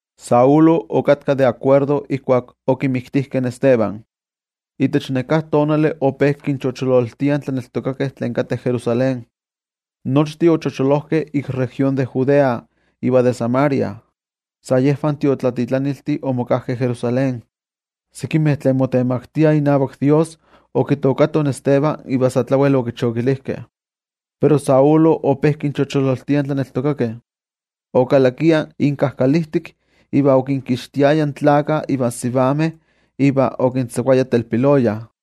Saulo okatka de akuerdo ijkuak okimiktijkeh in Esteban. Itech neká tonali ope kinchochololtiah in tlaneltokakeh tlen okatkah Jerusalén. Nochtin ochocholojkeh ik región de Judea iva de Samaria. Sa yejvan tiotlatitlaniltih omokajkeh Jerusalén. Sekimeh tlen motemaktiah inavak Dios okitookatoh in Esteban iva sa tlawel okichokilijkeh. Pero Saulo ope kinchochololtia in tlaneltokakeh. Okalakia inkajkalijtik iva okinkixtiaya tlakah ivan sivameh iva okintzakuaya telpiloya.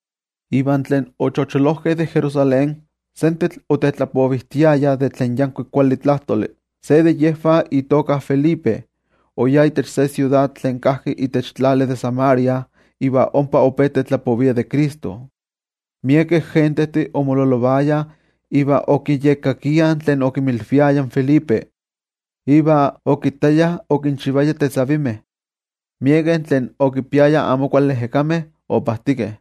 Iva tlen ochocholojkeh de Jerusalén, sentetl otetlapovijtiayah de tlen yankuik kuali tlajtoli. Se de yejvah itoka Felipe, oyá itech se siudad tlen kajki itech tlali de Samaria iva ompa ope tetlapovia de Cristo. Miekeh gentejtih omololovayah iva okiyekkakiah tlen okinmilviaya in Felipe. Iva okittayah okinchivaya tetzavkaneskayomeh. Miekeh tlen okipiayah amo kuali ejekameh opajtikeh,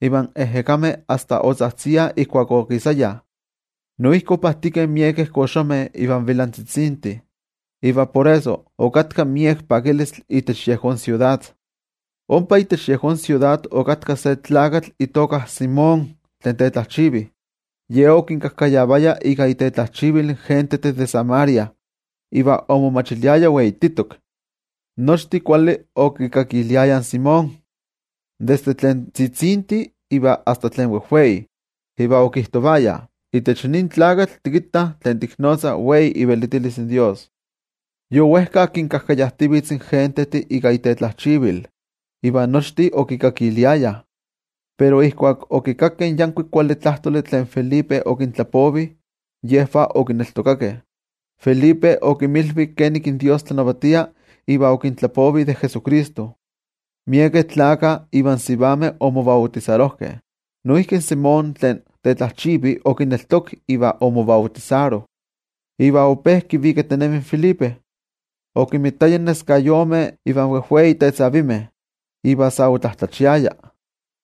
iva in ejekameh asta otzajtziah ijkuak okisayah. Noijki opajtikeh miekeh koxomeh ivan vilantzitzintih. Iva por eso, okatka miek pakilistli itech yejón siudad. Ompa itech yejón siudad okatka se tlakatl itoka Simón tlen tetlajchivi. Ye okinkajkayavaya in gentejtih de Samaria ika itetlajchivil. Iva omomachiliaya weititok. Nochtin kuali okikakiliayah in Simón, desde tlen tzitzintih iva asta tlen wejweih, iva okijtovayah: —Itech nin tlakatl tikittah tlen tiknotzah wei ivelitilis in Dios. Yowejka kinkajkayajtivitz in gentejtih ika itetlajchivil, iva nochtin okikakiliayah. Pero ijkuak okikakkeh in yankuik kuali tlajtoli tlen Felipe okintlapovi, yejvah okineltokakeh. Felipe okinmilvi kenik in Dios tlanavatia iva okintlapovi de Jesucristo. Miekeh tlakah iva sivameh omobautisarojkeh. Simón tlen tetlajchivi noijki okineltokak iva omobautisaro, iva ope kivikatinemi in Felipe. Okinmitaya in neskayomeh iva wejwei tetzavimeh, iva sa otlatlachiaya.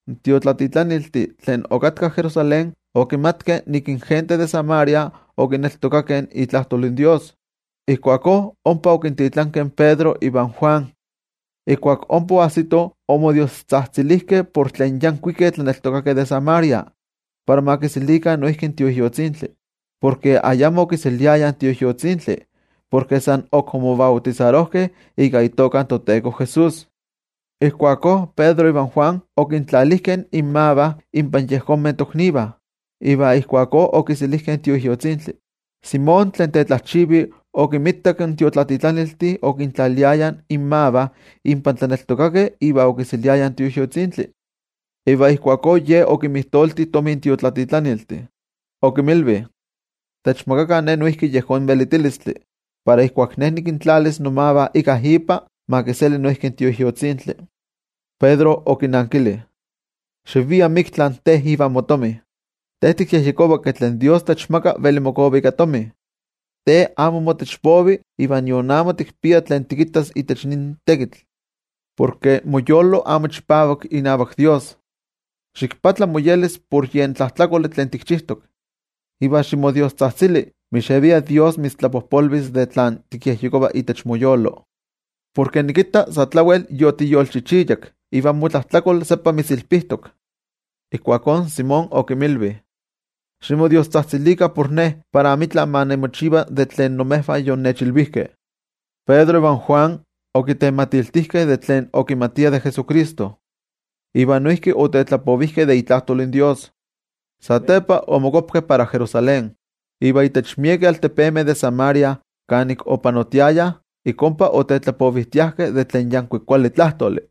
In tiotlatitlaniltih tlen okatkah Jerusalén okimatkeh ke in gentejtih de Samaria okineltokakeh itlajtol in Dios. Ijkuakó ompa okintitlankeh in Pedro ivan Juan. Ijkuak ompa oajsitoh, omodiostzajtzilijkeh por tlen yankuikeh tlaneltokakeh de Samaria, para ma kiselikah noijki in Tioijyotzintli. Porke ayamo okiseliayah in Tioijyotzintli, porke san ok omobautisarojkeh ika itoka in toTeko Jesús. Ijkuakó Pedro ivan Juan okintlalijkeh inmavah inpan yejonmeh toknivah, iva ijkuakó okiselijkeh in Tioijyotzintli. Simón tlen tetlajchivi okinmitak in tiotlatitlaniltih okintlaliayah inmavah inpan tlaneltokakeh iva okiseliayah in Tioijyotzintli. Iva ijkuakó ye okinmijtolti tomi in tiotlatitlaniltih. Okinmilvi: —Techmakakah ne noijki yejón velitilistli, para ijkuak ne nikintlalis nomavah íkka ipa, ma kiseli noijki in Tioijyotzintli. Pedro okinankili: —¡Xiviah miktla te ivan motomi! Te tikyejyekova ke tlen toYejwatzi techmaka veli mokova ika tomi. Te amo motech povi iva nion amo tikpia tlen tikittas itech nin tlamantli, porke moyolo amo chipavak inavak toYejwatzi. Ximoyolkuapa por yen tlajtlakoli tlen tikchijtok, iva ximodiostzajtzili, mixevia toYejwatzi mitztlapojpolvis de tlen tikyejyekova itech moyolo. Porke nikitta sa tlawel yotiyolchichiyak, iva motlajtlakol seppa mitzilpijtok. Ijkuakó in Simón okinmilvi: —Ximodiostzajtzilikah por ne, para amitla ma nimochiva de tlen imejvah yonnechilvijkeh. Pedro ivan Juan okitematiltijkeh tlen okimatiah de Jesucristo iva noijki otetlapovijkeh de itlajtol in Dios. Satepa omokuapkeh para Jerusalén. Iva itech miekeh altepemeh de Samaria kanik opanotiayah, ik ompa otetlapovijtiajkeh de tlen yankuik kuali tlajtoli.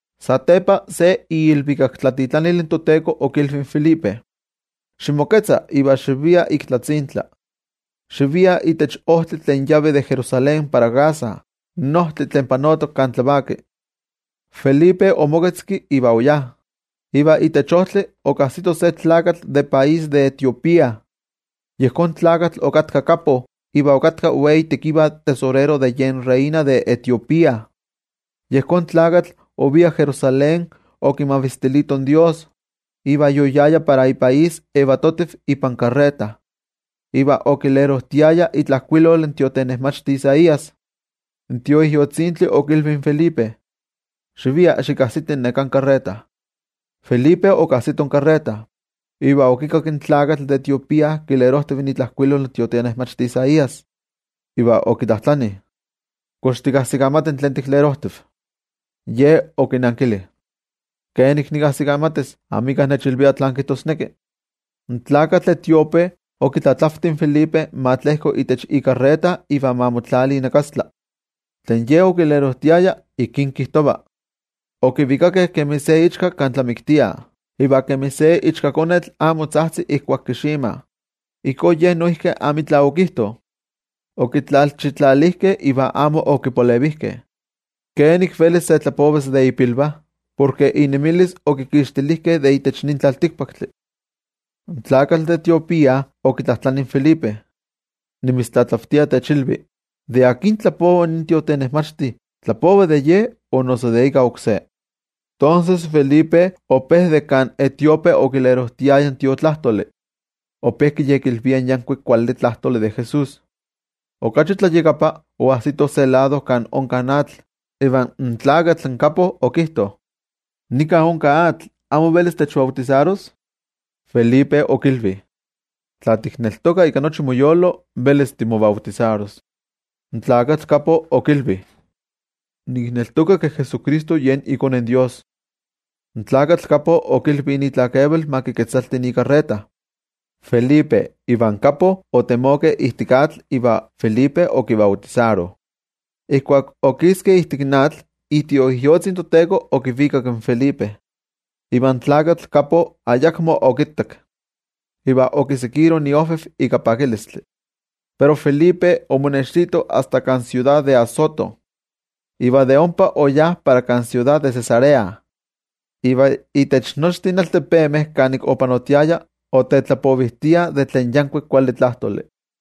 Satepa se iilvikaktlatitlanil in toTeko okilvi in Felipe: —Ximoketza iva xivia ik tlatzintla. Xivia itech ojtli tlen yavi de Jerusalén para Gaza, in ojtli tlen panotok kan tlavaki. Felipe omoketzki iva oyá. Iva itech ojtli okajsito se tlakatl de país de Etiopía. Yejón tlakatl okatka kappo iva okatka wei tekiva tesorero de yen reina de Etiopía. Yejón tlakatl ovia Jerusalén okimavistilito in Dios. Iva yoyaya para ipaís yetiv ipan ikarreta, iva okilerojtiaya itlajkuilol in tiotenejmachti Isaías. In Tioijyotzintli okilvi in Felipe: —Xivia xikajsiti neká karreta. Felipe okajsito in karreta, iva okikakki in tlakatl de Etiopía kilerojtiv itlajkuilol in tiotenejmachti Isaías, iva okitlajtlani: —¿Kox tikajsikamati tlen tiklerojtiv? In ye okinankili: —¿Kenik nikajsikamatis? Amika nechilvia tlán kijtosneki. In tlakatl etiope okitlatlavti in Felipe ma tlejko itech ikarreta iva ma motlali inakastla. Tlen ye okilerojtiaya ijkí kijtova: Okivikakeh kemi se ichka kan tlamiktiah. Iva kemi se ichkakonetl amo tzajtzi ijkuak kiximah, ijkó Ye noijki amitla okijto. Okitlalchitlalijkeh, iva amo okipalevijkeh. ¿Kenik velis se tlapovas de ipilvah? Porke inemilis okikixtilijkeh de itech nin tlaltikpaktli. In tlakatl de Etiopía okitlajtlani in Felipe: —Nimitztlatlavtia techilvi, ¿de akin tlapova nin tiotenejmachti, tlapova de ye o noso de íkka oksé? Tonses, Felipe ope de kan etiope okilerojtiaya in Tiotlajkuiloli, ope kiyekilvia in yankuik kuali tlajtoli de Jesús. Okachi tlayakapa, oajsitoh se lado kan onka atl, iva in tlakatl kappo okijto: —Nika onka atl, ¿amo velis techbautisaros? Felipe okilvi: —Tla tikneltoka ika nochi moyolo, velis timobautisaros. In tlakatl kappo okilvi: —Nikneltoka ke Jesucristo yen iKone in Dios. In tlakatl kappo okilvi itlakeval ma kiketzalti ikarreta. Felipe ivan kappo otemokeh ijtik atl, iva Felipe okibautisaro. Ijkuak okiskeh de ijtik atl, iTioijyotzi in toTeko okivikak in Felipe, iva in tlakatl kappo ayakmo okittak, iva okitokak iojviv ika pakilistli. Pero Felipe omonextito asta kan siudad de Azoto, iva de ompa oyá para kan siudad de Cesarea. Iva itech nochtin altepemeh kanik opanotiaya, otetlapovijtia de tlen yankuik kuali tlajtoli.